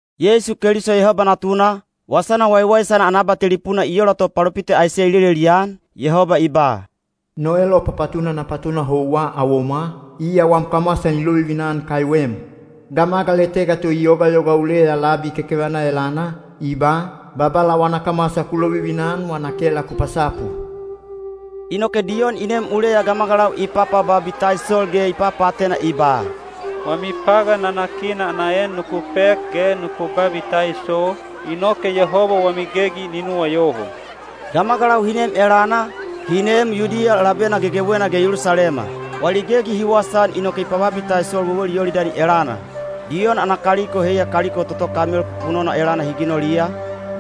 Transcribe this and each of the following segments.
Yeisu Keliso Yehoba Natuna, wasana waiwaisana ana abatelipuna i ola to palopita Aiseya i lelelian, Yehoba i ba: No elopapatuna na patuna houwa awomwa, iya wam kamwasa ni lovivina-an kaiwem. Gamagal etega to i yogayoga uleya labi kekevana elana, i ba, “Babala wana kamwasa ku lovivina-an wana kela ku pasapu.” Inoke Diyon i nem uleya gamagalau i papababitaisol ge i papaatena i ba, “Wami pagan nanakina ana en nuku pek ge nuku babitaiso, inoke Yehoba wami gegi ni nuwayoho.” Gamagalau hi nem elana, hi neem Yudiya labena gegewena ge Yelusalema. Wali gegi hi wasaan inoke i pababitaisol wewel Yolidani elana. Diyon ana kaliko heiya kaliko toto kamel pupunona elana hi ginoliya,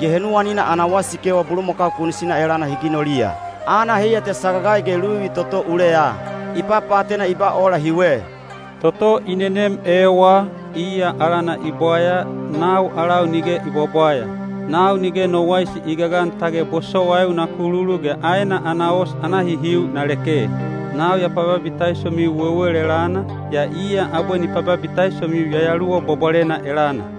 ge henuwanina ana wasikewa bulumakau kunisina elana hi ginoliya. Aana heiya te sagagai ge luvi toto uleya. I papaatena i ba ola hiwe, “Toto i nenem ewa, iya alana i bwaya, nau alau nige i bwabwaya. Nau nige no waisi i gagan tage bosowaiu na lokululu ge aena ana os ana hihiu na leke. Nau ya pababitaisomiu wewel elana, yaa iya abwe ni pababitaisomiu Yayaluwa Bwabwalena elana.”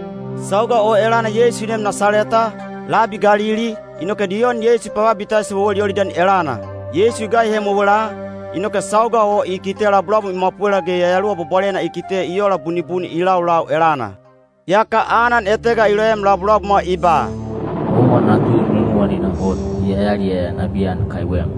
Sauga o elana Yeisu i neem Nasaleta, labi Galili, inoke Diyon Yeisu i pababitaiso wewel Yolidani elana. Yeisu i gaihem wewela, inoke sauga o i kite labulabum i mwapwela ge Yayaluwa Bwabwalena i kite i ola bunibuni i laulau elana. Yaka anan etega i loem labulabumwa i ba, “Owa natu nunuwanina hot; ya yaliyaya nabiyan kaiwem.”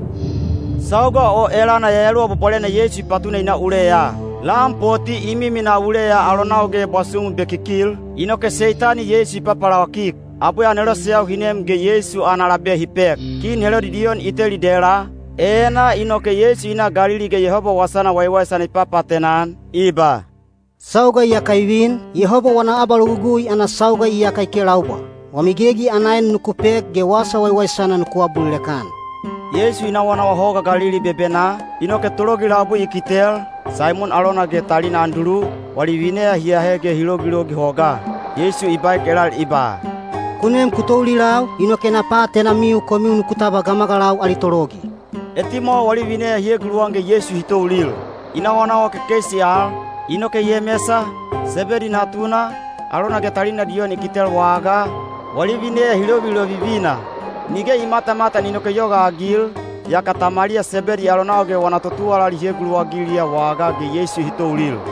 Sauga o elana Yayaluwa Bwabwalena Yeisu i patuna i na uleya. Lan poti i miminaa uleya alonau ge bwasumu bekikil, inoke Seitani Yeisu i papalawakik. Abwe aneloseyau hi nem ge Yeisu ana labe hi pek. Kin Helodi Diyon i teli dela, enaa inoke Yeisu i na Galili ge Yehoba wasana waiwaisana i papaatena-an, i ba, “Sauga iyaka i vin, Yehoba wana abalogugui ana sauga iyaka i kelaubwa. Wami gegi ana en nuku pek ge wasa waiwaisana nuku abulilek-an.” Yeisu i nawanawa Hoga Galili bebenaa, inoke tologi labui i kitel, Saimon alona ge talina Andulu, wali vineya hi ahe ge hi logilogi hogaa. Yeisu i baek elal i ba, “Ku nem ku toulilau, inoke na paatenamiu komiu nuku tabwa gamagalau ali tologi.” Etimwawa wali vineya hi eguluwan ge Yeisu hi toulil. I nawanawa kekeisi al, inoke Yemesa, Sebedi natuna, alona ge talina Diyon i kitel wagaa, wali vineya hi lovilovivina. Nige i matamatan inoke i yogaagil, yaka tamaliya Sebedi alonau ge wana totuwalali hi eguluwagiliya wagaa ge Yeisu hi toulil.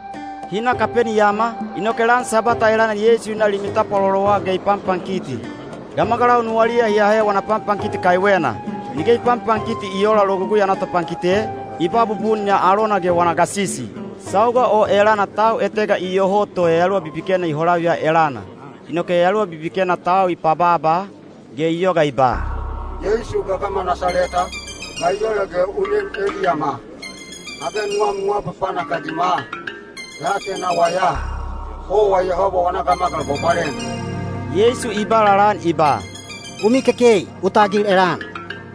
Hi na Kapeniyama, inoke lan Sabwata elana Yeisu i na limi tapwalolowa ge i panpankiti. Gamagalau nuwaliya hi ahe wana panpankiti kaiwena. Nige i panpankiti i oola Logugui ana topankite, i ba bubun ya alona ge wana gasisi. Sauga o elana tau etega iyoho to yayaluwa bibikena i holaviya elana. Inoke yayaluwa bibikena tau i pabaaba, ge i yoga i ba, “Yeisu gagama Nasaleta, ga i ola ge u nem eliyama? Age nuwam nu apapanak-agima? Ya atenawa ya, owa Yehoba wana Gamagal Bwabwalena!” Yeisu i ba lalaan i ba, “U mikekei! U tagil elana!”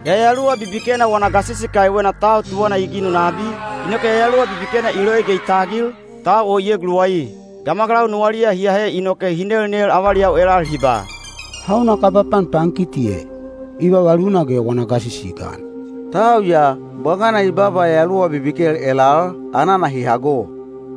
Yayaluwa bibikena wana gasisi kaiwena tau tuwana i ginu nabi, inoke yayaluwa bibikena i loi ge i tagil, tau o i eguluwai. Gamagalau nuwaliya hi ahe inoke hi nelnel avaliyau elal hi ba, “Hauna kaba panpankiti e? I vavaluna ge wana gasisi i gan! Tau ya, bwagana i baaba yayaluwa bibikel elal, anana hi hago.”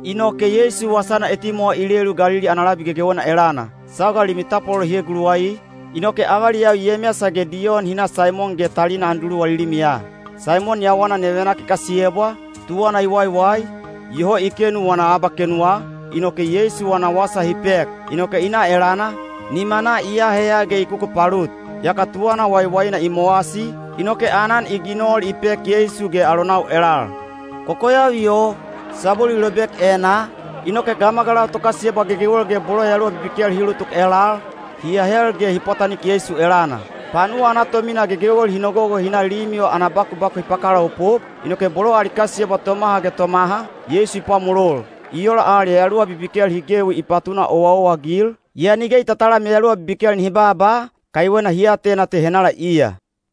Inoke Yeisu wasana etimwawa i lelu Galili ana labi gegewena elana. Sauga limi tapwalolo hi eguluwai, inoke avaliyau Yemesa ge Diyon hi na Saimon ge talina Andulu wali limiya. Saimon yawana nevenak i kasiyebwa, tuwana i waiwai, iyoho i kenu wana abakenuwa, inoke Yeisu wana wasa hi pek. Inoke i na elana, nimanaa i aheya ge i kukupalut. Yaka tuwana waiwaina i mowasi, inoke aanan i ginol i pek Yeisu ge alonau elal. Kokoyavi o, sabwelu i lobek enaa, inoke gamagalau tokasiyebwa gegewel ge bolo yayaluwa bibikel hi ulutuk elal, hi ahel ge hi pwatanik Yeisu elana. Panuwa ana tomina gegewel hi nogogo hi na limi o ana bakubaku hi pakalaopop, inoke bolo ali kasiyebwa tomaha ge tomaha, Yeisu i pwamolol. I ola al yayaluwa bibikel hi gewi i patuna owaowa-agil, yaa nige i tatalam yayaluwa bibikel nihi baaba, kaiwena hi atena te henala iya.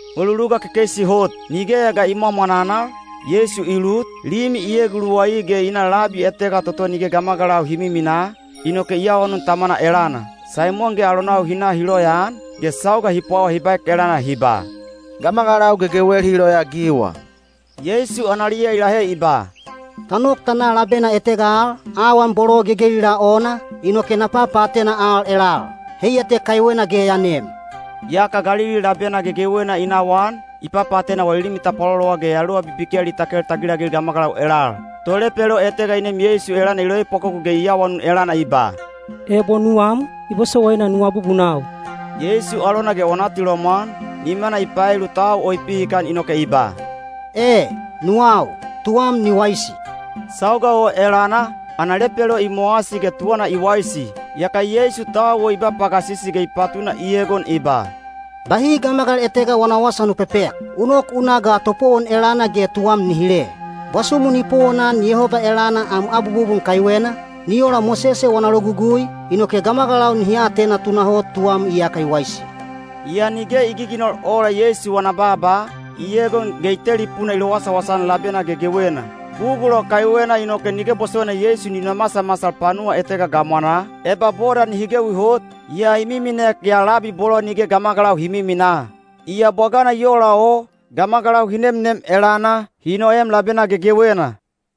Mweluluga kekeisi hot, nigeya ga i mwamwananal, Yeisu i lut, limi i eguluwai ge i na labi etega toto nige gamagalau hi miminaa, inoke i awanun Tamana elana. Saimon ge alonau hi na hi loyaan, ge sauga hi pwawa hi baek elana hi ba, “Gamagalau gegewel hi loyaagiwa.” Yeisu analiya i lahe i ba, “Ta nok ta na labena etega al, awan bolo gegelilaa ona, inoke na papaatena al elal. Heiya te kaiwena ge ya nem.” Yaka Galili labena gegewena i nawaan, i papaatena wali limi tapwalolowa ge yayaluwa bibikel i takel tagilagil gamagalau elal. Tolepelo etega i nem Yeisu elana i loepwakoku ge i awanun gagasisi elana i ba, “Ebo nuwam, i bosowaina nu abubunau.” Yeisu alona ge wana atilomwan, nimana i paelu tau o i pihikan inoke i ba, “E, nuwau. Tuwam ni waisi!” Sauga o elana, ana lepelo i mowasi ge tuwana i waisi. Yaka Yeisu tau o i ba pagasisi ge i patuna i egon i ba, “Bahi gamagal etega wana wasa nu pepek. U nok u na ga topowon elana ge tuwam ni hile. Bwasumu ni powonan Yehoba elana am abwabubun kaiwena, ni ola Mosese wana Logugui, inoke gamagalau nihi atena tunahot tuwam iyaka i waisi.” Yaa nige i giginol ola Yeisu wana baaba, i egon ge i telipuna i lowasawasa-an labena gegewena. Bugul o kaiwena inoke nige bosowaina Yeisu ni nomasamasal panuwa etega gamwanaa, eba boda nihi gewi hot, yaa i miminek ya labi bolo nige gamagalau hi miminaa. Yaa bwagana i ola o, gamagalau hi nemnem elana, hi noem labena gegewena.